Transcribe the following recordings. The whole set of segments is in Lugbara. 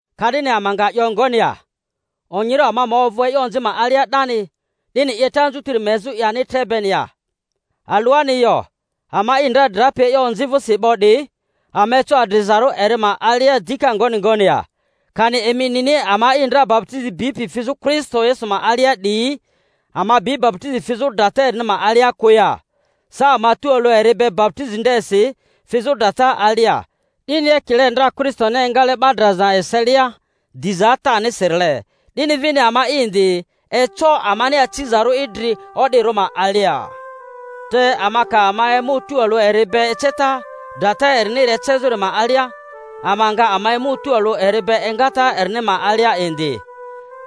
Ka'dini ama nga 'yo ngoni ya? Onyirᴜ ama ma ovᴜ e'yo onzi ma alia 'dani, 'dini 'yeta anzutiri ma ezᴜ ani tre beni ya? Alᴜani yo! Ama'i ndra drapi e'yo onzi vᴜsi 'bo 'diyi, ama eco adrizarᴜ eri ma alia dika ngoni ngoni ya? Kani emi nini ama'i ndra baputizi bipi fizᴜ Kristo Yesu ma alia 'diyi, ama bi baputizi fizᴜ drata erini ma alia kᴜ ya? Sa ama tualᴜ eri be baputizi ndesi fizᴜ drata alia, 'dini ekile ndra Kristoni engale 'ba draza eselia diza Atanisirile, 'dini vini ama'i indi, eco amani acizarᴜ idri o'dirᴜ ma alia. Te ama ka ama emᴜ tualᴜ eri be eceta drata eriniri ecezᴜri ma alia, ama nga ama emᴜ tualᴜ eri be engata erini ma alia indi.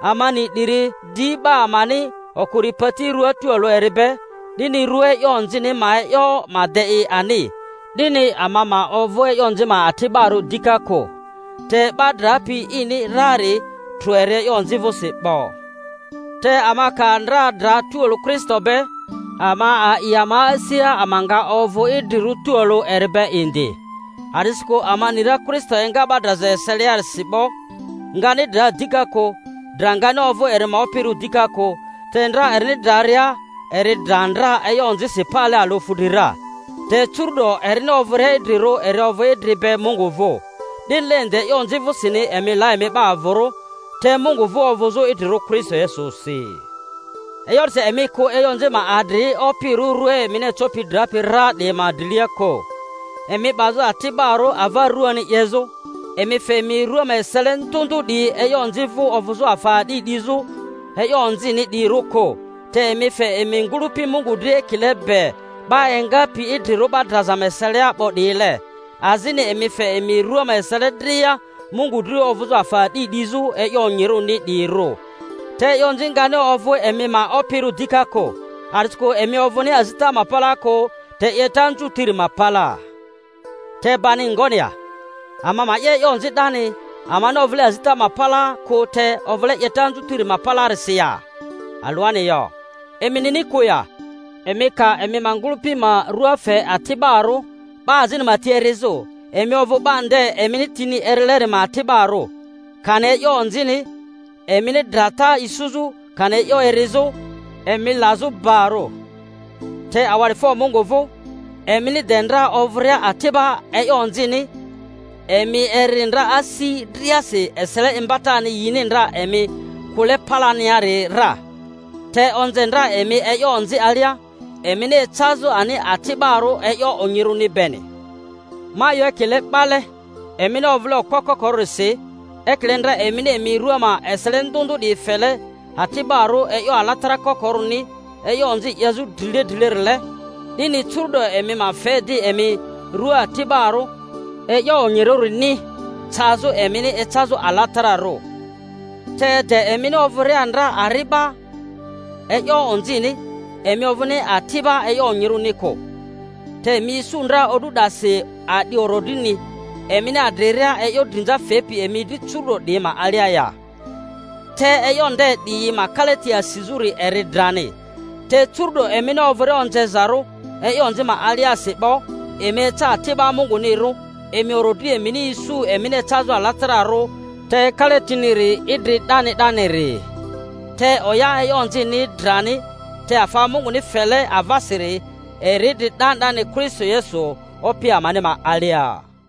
Ama ni 'diri, di 'ba amani okuri pati ruaa tualᴜ eri be, 'dini rua e'yo onzini ma e'yo ma de i ani, 'dini ama ma ovᴜ e'yo onzi ma ati'barᴜ dika kᴜ. Te 'ba drapi ini rari, trᴜ eri e'yo onzi vᴜsi 'bo. Te ama ka ndra dra tualᴜ Kristo be, ama a'i ama asia ama nga ovᴜ idrirᴜ tualᴜ eri be indi. A’disikᴜ ama ni ra Kristo enga 'ba draza ma eseliarisi 'bo, ngani dra dika kᴜ; dra ngani ovᴜ eri ma opirᴜ dika kᴜ. Te ndra erini draria, eri dra ndra e'yo onzisi pale alᴜ fudri ra, te curu-'do erini ovᴜria idrirᴜ eri ovᴜ idri be Mungu vᴜ. 'Dinile indi, e'yo onzi vᴜsini emi la emi 'ba avᴜrᴜ, te Mungu vᴜ ovᴜzᴜ idrirᴜ Kristo Yesusi. E'yo 'disi emi kᴜ e'yo onzi ma adri opirᴜ rua emini ecopi drapi ra 'diyi ma drilia kᴜ, emi 'bazᴜ ati'barᴜ ava ruani 'yezᴜ. Emi fe emi rua ma esele ndᴜ ndᴜ 'diyi e'yo onzi vᴜ ovᴜzᴜ afa a'di 'dizᴜ e'yo onzini 'diyirᴜ kᴜ, te emi fe emi ngᴜlᴜpi Mungu dri ekile be 'ba engapi idrirᴜ 'ba draza ma eselia 'bo 'diyile, azini emi fe emi rua ma esele dria Mungu dri ovᴜzᴜ afa a'di 'dizᴜ e'yo onyirᴜrini 'diyirᴜ. Te e'yo onzi ngani ovᴜ emi ma opirᴜ dika kᴜ, a'disikᴜ emi ovᴜni azita ma palaa kᴜ, te 'yeta anzutiri ma palaa. Te bani ngoni ya? Ama ma 'ye e'yo onzi 'dani, amani ovᴜle azita ma palaa kᴜ te ovᴜle 'yeta anzutiri ma palaarisi ya? Alᴜani yo! Emi nini kᴜ ya, emi ka emi ma ngᴜlᴜpi ma rua fe ati'barᴜ 'ba azini ma ti erizᴜ, emi ovᴜ 'ba nde emini tini erileri ma ati'barᴜ; kani e'yo onzini, emini drata isuzᴜ, kani e'yo erizᴜ, emi lazᴜ barᴜ. Te awa'difo Mungu vᴜ, emini de ndra ovᴜria ati'ba e'yo onzini, emi eri ndra asi driasi esele imbatani yini ndra emi kᴜle palaniari ra. te onze ndra emi e'yo onzi alia, emini ecazᴜ ani ati'barᴜ e'yo onyirᴜni beni. Ma 'yo ekile 'bale, emini ovᴜle okpo kokorᴜrisi. Ekile ndra emini emi rᴜa ma esele ndᴜ ndᴜ 'diyi fele ati'barᴜ e'yo alatara kokorᴜni e'yo onzi 'yezᴜ drile drilerile, 'dini curᴜ'do emi ma fe di emi rua ati'barᴜ e'yo onyirᴜrini cazᴜ emini ecazu alatararᴜ. Te de emini ovᴜria ndra ari'ba e'yo onzini, emi ovᴜni ati'ba e'yo onyirᴜni kᴜ. Te emi isu ndra o'du 'dasi a'di orodrini, emini adriria e'yo drinza fepi emi dri curu'do 'diyi ma alia ya? Te e'yo nde 'diyi ma kalati asizᴜri eri drani. Te curu'do emini ovᴜria onzezarᴜ e'yo onzi ma aliasi 'bo, emi eca ati'ba Mungunirᴜ, emi orodri emini isu emini ecazᴜ alatararᴜ, te kalatiniri idri 'dani 'daniri. Te oya e'yo onzini eri drani, te afa Munguni fele avasiri eri idri 'dani 'dani Kristo Yesu Opi amani ma alia.